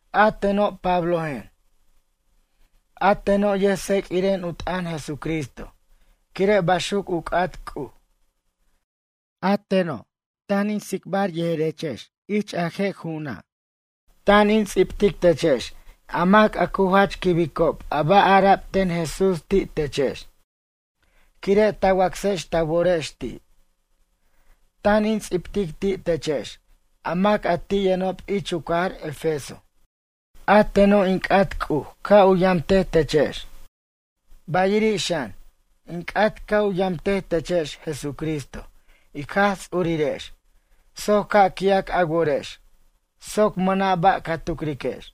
A teno' Pablojen. A teno' yʌjts'eq'uiren u t'ʌn Jesucristo quire' baxuc u c'at C'uj. A teno', tan in tsicbar yejerechex ich a je' ju'una'. Tan in ts'ibtic techex a mac a cu jach quibicob a ba' ara'b ten Jesús ti' techex quire' ta wacsex ta worex ti'. Tan in ts'ibtic ti' techex a mac a ti' yʌnob ich u cajar Efeso. A teno' in c'at C'uj ca' u yamtej techex, bayiri' xan, in c'at ca' u yamtej techex Jesucristo ic Jaj Ts'urirex soc ca' qui'ac a worex soc mʌna' ba' ca tucriquex.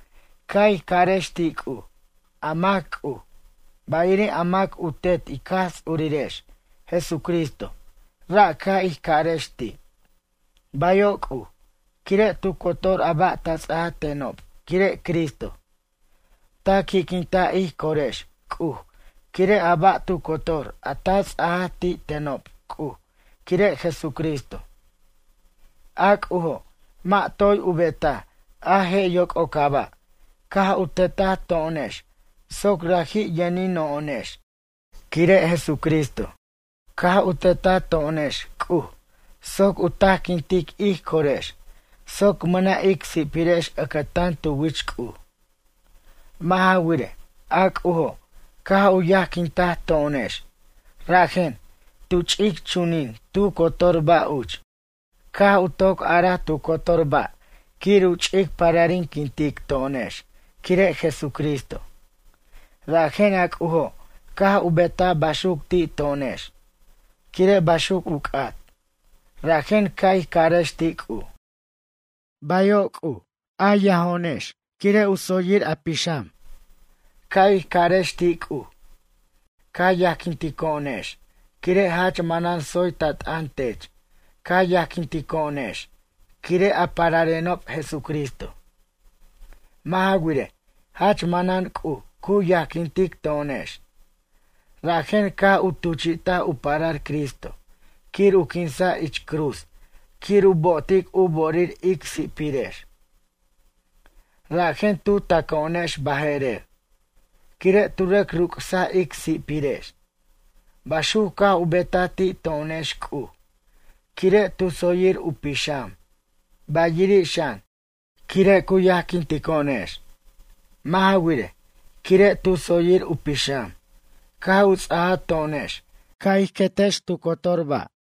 Ca' ij carex ti' C'uj, a mac C'uj, bayiri' a mac u Tet ic Jaj Ts'urirex, Jesúsristo, ra' ca' ij carex ti': “Bayo' C'uj, quire' tu cotor a ba' ta ts'aj tenob quire' Cristo. Ta qui'quintaj ij corex C'uj quire' a ba' tu cotor a ta ts'ajaj ti' tenob C'uj quire' Jesucristo.” A C'ujo' mʌ' toy u betaj a je' yoc'ocaba', caj u tetaj to'onex soc raji' yʌnino'onex quire' Jesucristo. Caj u tetaj to'onex C'uj soc u tajquintic ij corex soc mʌna' ic si'pirex ʌcʌtan tu wich C'uj. Mʌ' ja wirej, a C'ujo caj u yajquintaj to'onex, rajen, tu ch'ic chunin tu cotor ba' uch, caj u toc araj tu cotor ba' quir u ch'ic pararinquintic to'onex quire' Jesucristo. Rajen a C'ujo' caj u betaj baxuc ti' to'onex, quire' baxuc u c'at. Rajen ca' ij carex ti' C'uj: “Bayo' C'uj, ca yajo'onex quire' u tsoyir a pixam.” Ca' ij carex ti' C'uj: “A yajquintico'onex quire' jach manan tsoy ta t'ʌn tech ca yajquintico'onex, quire' a pararenob Jesucristo.” Mʌ' ja wirej, jach manan C'uj cu yajquintic to'onex, rajen caj u tuchi'taj u parar Cristo quir u quinsa' ich cruz quir u bo'otic u bo'orir ic si'pirex. Rajen, tu taco'onex baje'rer, quire' tu rʌc rucsaj ic si'pirex. Baxuc caj u betaj ti' to'onex C'uj quire' tu tsoyir u pixam, bayiri' xan, quire' cu yajquintico'onex. Mʌ' ja wirej, quire' tu tsoyir u pixam, caj u ts'aja to'onex ca' ij querex tu cotor ba'.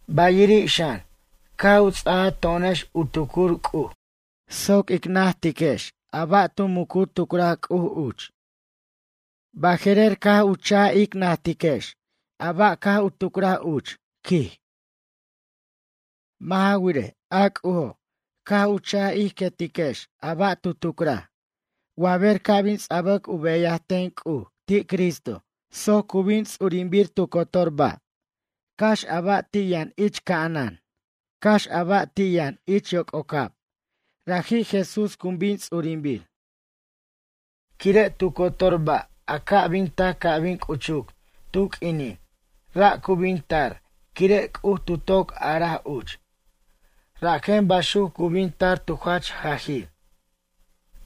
Bayiri' xan, caj u ts'aja to'onex u tucur C'uj soc ic najtex a ba' tu muc u tucraj C'uj uch. Baje'rer caj u cha'ic ic najtiquex a ba' caj tu tucraj uch, quij. Mʌ' ja wirej, a C'ujo' caj u cha' ij querex a ba' tu tucraj wa ber ca' bin ts'abac u beyaj ten C'uj ti' Cristo soc cu bin ts'urinbir tu cotor ba'. Cax a ba' ti' yʌn ich ca'anan, cax a ba' ti' yʌn ich yoc'ocab, raji' Jesús cu bin ts'urinbir. Quire' tu cotor ba' a ca' bin tac ca' bin c'uchuc tu q'uinin, ra' cu bin tar quire' C'uj tu toc araj uch, rajen baxuc cu bin tar tu jach jajir.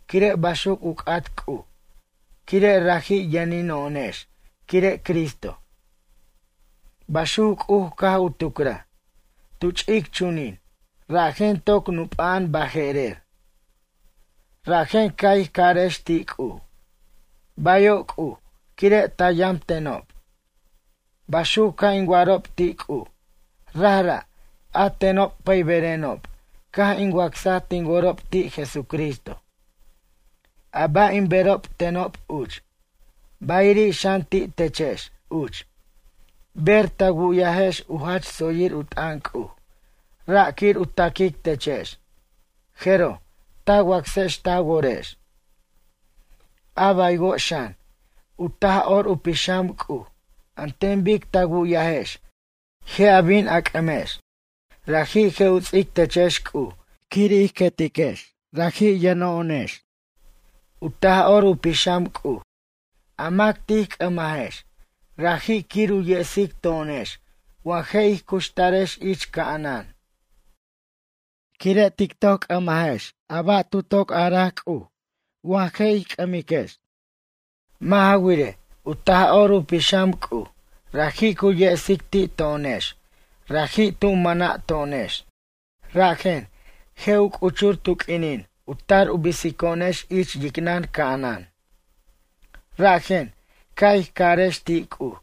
Quire' baxuc u c'at C'uj quire' raji' yʌnino'onex quire' Cristo. Baxuc C'uj caj u tucraj, tu ch'ic chunin, rajen toc nup'a'an baje'rer. Rajen ca' ij carex ti' C'uj: “Bayo' C'uj quire' ta yamtenob.” Baxuc ca' in wa'arob ti' C'uj, rajra', a tenob pʌyberenob caj in wacsaj tin worob ti' Jesucristo. A ba' in berob tenob uch, bayiri' xan ti' techex uch, ber ta wu'yajex u jach tsoyir u t'ʌn C'uj, ra' quir u taquic techex, jeroj, ta wacsex ta worex. A baywo' xan, u Taj'or u Pixam C'uj an ten bic ta wu'yajex je' a bin c'ʌmex. Raji' je' u ts'ic techex C'uj quir ij querex raji' yʌneno'onex. U Taj'or u Pixam C'uj, a mac tij c'ʌmajex, raji' quir u yesic to'onex wa je' ij cuxtarex ich ca'anan. Quire' tic toc c'ʌmajex a ba' tu toc araj C'uj wa je' ij c'ʌmajex. Mʌ' ja wirej, u Taj'or u Pixam C'uj raji' cu yesic ti' to'onex raji' tu mana to'onex. Rajen, je' u c'uchur tu q'uinin u tar u bisico'onex ich yicnʌn ca'anan. Rajen, ca' ij carex ti' C'uj: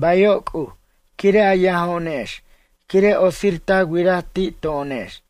“Bayo' C'uj quire' a yajo'onex quire' otsir ta wiraj ti' to'onex.”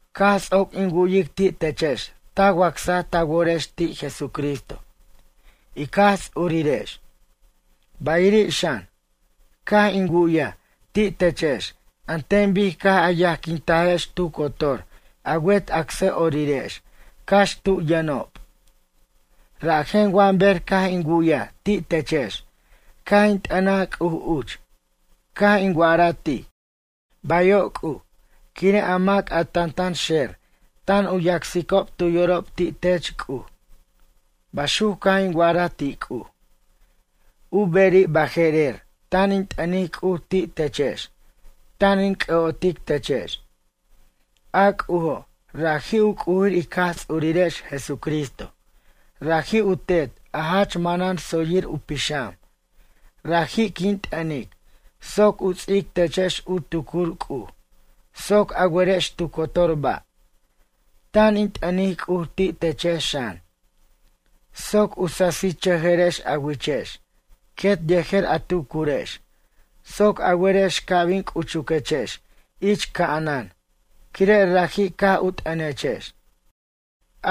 Caj ts'oc in wu'yic ti' techex ta wacsaj ta worex ti' Jesucristo, ic Jaj Ts'urirex. Bayiri' xan, caj in wu'ya ti' techex an ten bic caj a yajquintajex tu cotor a wet acsʌ'orirex cax tu yʌnob. Rajen, wa ber caj in wu'yaj ti' techex caj in t'ʌnaj C'uj uch, caj in wa'ara ti': “Bayo' C'uj quire' a mac a tantan xer tan u yacsicob tu yorob ti' tech C'uj.” Baxuc caj in wa'araj ti' C'uj. U beri' baje'rer tan in t'ʌnic C'uj ti' techex, tan in c'ʌ'otic techex. A C'ujo', raji' u C'ujir ic Jaj Ts'urirex Jesucristo, raji' u Tet a jach manan tsoyir u pixam, raji' quin t'ʌnic soc u ts'ic techex u tucur C'uj soc a werex tu cotor ba'. Tan in t'ʌnic C'uj ti' techex xan, soc u sasichʌjʌrex a wichex quet yejer a tucurex soc a werex ca' bin c'uchuquechex ich ca'anan quire' raji' caj u t'ʌnechex.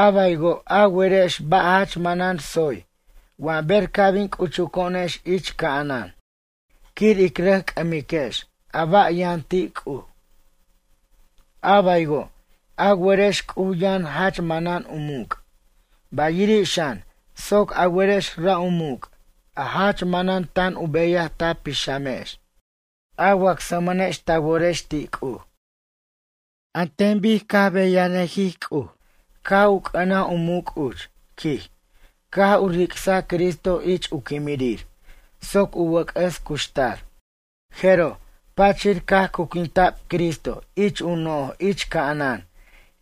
A baywo' a werex a ba' jach manan tsoy wa ber ca' bin c'uchuco'onex ich ca'anan quir ic rʌc c'ʌmiquex a ba' yʌn ti' C'uj. A baywo' a werex C'uj yʌn jach manan u muc', bayiri' xan soc a werex ra' u muc' a jach manan tan u beyaj ta pixamex, a wacsmʌnex ta worex ti' C'uj. An ten bic u beyanʌjij C'uj caj u c'ʌnaj u muc' uch, quij, caj u ric'saj Cristo ich u quimirir soc u wʌc'ʌs cuxtar. Jeroj, pachir caj cuquintac Cristo ich u noj ich ca'anan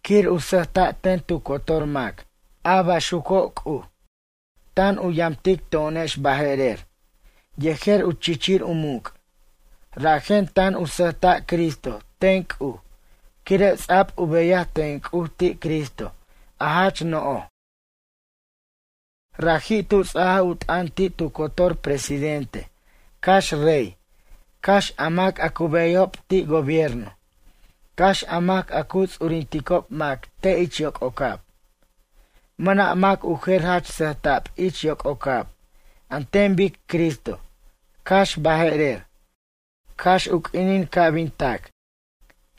quir u sʌjta' ten tu cotor mac, a baxuco' C'uj, tan u yamtic to'onex baje'rer yejer u chichir u muc'. Rajen, tan u sʌjta' Cristo ten C'uj quire' ts'a'b u beyaj ten C'uj ti' Cristo a jach no'oj. Raji' tu ts'ajaj u t'ʌn ti' tu cotor presidente cax rey, cax a mac a cu beyajob ti' gobierno, cax a mac a cu ts'urinticob mac te' ich yoc'ocab. Mʌna' mac u jer jach sʌjta'b ich yoc'ocab an ten bic Cristo, cax baje'rer, cax u q'uinin ca' bin tac.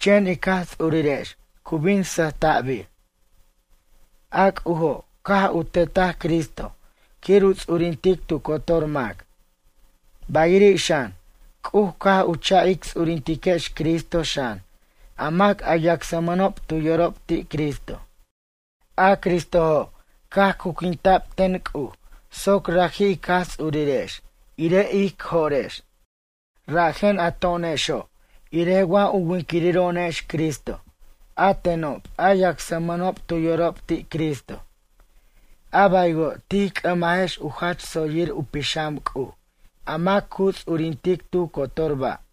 Chen ic Jaj Ts'urirex cu bin sʌjta'bir. A C'ujo' caj u tetaj Cristo quir u ts'urintic tu cotor mac. Bayiri' xan, C'uj caj u cha' ic ts'urintiquex Cristo xan a mac a yacsmʌnob tu yorob ti' Cristo. A Cristojo' caj cuquinta'b ten C'uj soc raji' ic Jaj Ts'urirex irej ic jo'rex. Rajen a to'onexo' irej wa u winquiriro'onex Cristo, a tenob a yacsmʌnob tu yorob ti' Cristo, a baywo' tij c'ʌmajex u jach tsoyir u pixam C'uj, a mac cu ts'urintic tu cotor ba'.